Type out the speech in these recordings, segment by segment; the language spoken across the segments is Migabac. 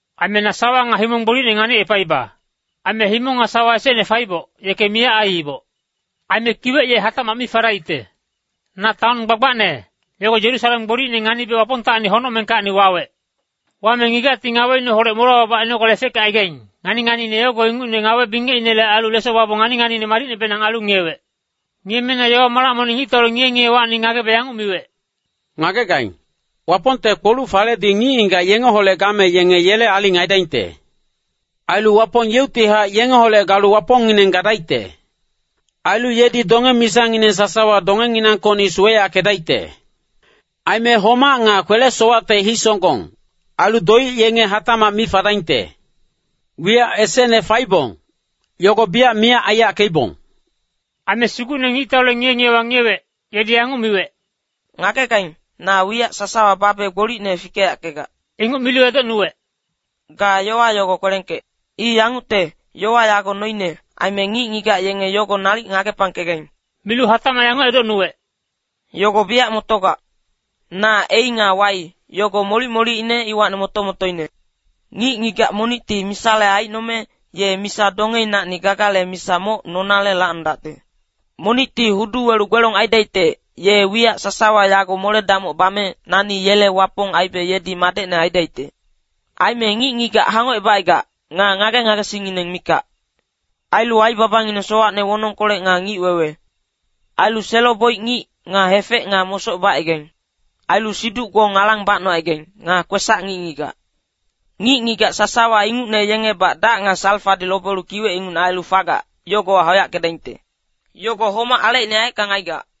Aime na sawa nga himong gbolicne nganicepaiba. Aime himong nga sawa esecne faiboc, yeke miyac aiiboc. Aime kiwec ye hatacmac mi fadaicte. Na taon gbagbacne, yogo Yerusalem gbolicne nganibe Wapongtacni honocmengkacni wawec. Wame ngigacti ngaweineholec molewa babac ainogale efeckecaigac, ngani-nganiine yogo ingucne ngawe-bingecinele ailu leso babong ngani-nganiine madicnebenang ailu ngiyewec. Ngiyeme na yowa-malac monic ngictaule ngiye-ngiyewacni ngagebe yanguc miwec, “Ngagegaing, Wapongte kpoluc-faledi ngic-ngigac yengeholec game yenge yele aling aidaingte. Ailu Wapong yeuctihac yengeholec galu Wapongngineng gadaicte. Ailu yedi donge-misangineng sasawa dongenginangkocni suweyackedaicte. Aime homac nga kwele-sowacte hisonggong, ailu doic yenge hatacmac mi fadaingte. Wiyac esecne faibong, yogo biyac miyac aiyackeibong.” Aime Sugucne ngictaule ngiye-ngiyewa ngiyewec, yedi yanguc miwec, “Ngagegaing, na wiyac sasawa babe gbolicne fikeyackegac.” Inguc milu edocnuwec, “Ga yowa yogo kwelengkec. I yangucte, yowa yago noine, aime ngic-ngigac yenge yogo nalic ngagepangkegaing.” Milu hatacmac yanguc edocnuwec, “Yogo biyac motogac. Na ‘A’ nga ‘Y’, yogo molic-molicine iwacni moto-motoine. Ngic-ngigac monicti misale aicnome, ye misa dongeinacni gagale misa moc nonale lacnodacte. Monicti hudu welu gbelong aidaicte, ye wiyac sasawa yago mole-damoc bame, nani yele Wapong aibe yedi madecne aidaicte. Aime ngic-ngigac hangocebacaigac, nga ngage-ngagesingngineng mikac. Ailu aibabangineng sowacne wonongkolec nga ngic-wewe. Ailu selo-boic ngic, nga hefec nga mosoc bacaigaing. Ailu siduc-gbong alang bacnocaigaing, nga kwesac ngic-ngigac. Ngic-ngigac sasawa ingucne yengebac dac nga salfadi lobelu kiwec ingucne ailu fagac, yogowa hauyackedaingte. Yogo homac alecine yaeckang aigac.”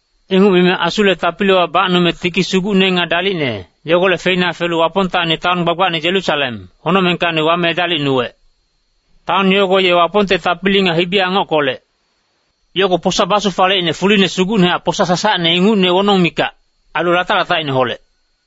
Inguc mime Asule tapiliwa bacnume tiki sugucne nga dalicne, yogolec feina felu Wapongtacni taon gbagbacne Yerusalem, honocmengkacni wame edalicnuwec. Taon yogo ye Wapongte tapili nga hibi-angockolec. Yogo posa basufaleicne fuline sugucnehac posa sasacne ingucne wonong mikac, ailu latac-latacineholec.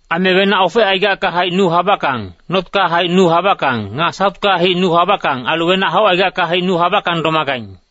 Aime wenac ofecaigacka haic nu habackang, notka haic nu habackang, nga sautka haic nu habackang, ailu wenac haucaigacka haic nu habackang domagaing.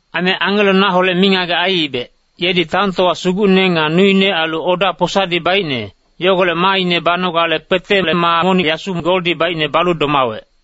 Aime angelo naholec mingagec aiibec, yedi taontowa sugucne nga nuine ailu oda posadi baicne, yogolec maaine banogale kpetele maa monic yasu goldi baicne balu domawec.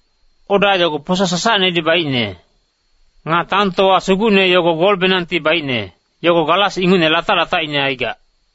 Oda yogo posa sasacnedi baicne. Nga taontowa sugucne yogo golbenangti baicne, yogo galas ingucne latac-latacine aigac.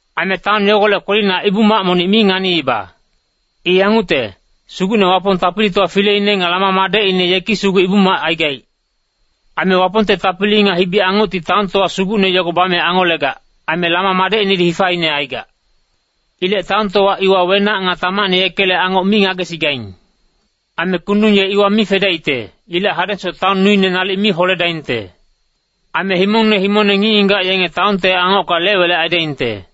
Aime taon yogolec kwelina Ibu-mac monic mi nganiiba. I yangucte, Sugucne Wapong Tapilitowa Fileine nga Lama madecine yeki sugu Ibu-mac aigaic. Aime Wapongte tapili nga hibi-angocti taontowa sugucne yogo bame angolegac, aime Lama madecinedi hifaine aigac. Ilec taontowa iwa wenac nga tamacne yekele angoc mi ngagesigaing. Aime kundung ye iwa mi fadaicte, ilec hadengsoc taon nuine nalic mi holedaingte. Aime himongne himongne ngic-ngigac yenge taonte angocka lec-welec aidaingte.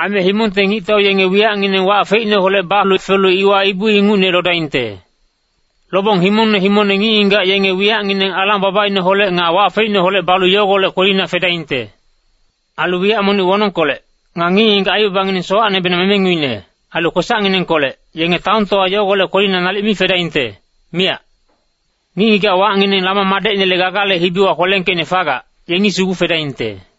Aime himongte ngictau yenge wiyacngineng wac feicneholec balu felu iwa ibu ingucne lodaingte. Lobong himongne himongne ngic-ngigac yenge wiyacngineng alang-babaineholec nga wac feicneholec balu yogolec kwelina fedaingte. Ailu wiyac monic wonongkolec nga ngic-ngigac aibabangineng sowacnebenang memenguine, ailu kwesacnginengkolec, yenge taontowa yogolec kwelina nalic mi fedaingte, miyac. Ngic-ngigac wacngineng Lama madecinele Gagale hibiwa kwelengkeicne fagac, yengi sugu fedaingte.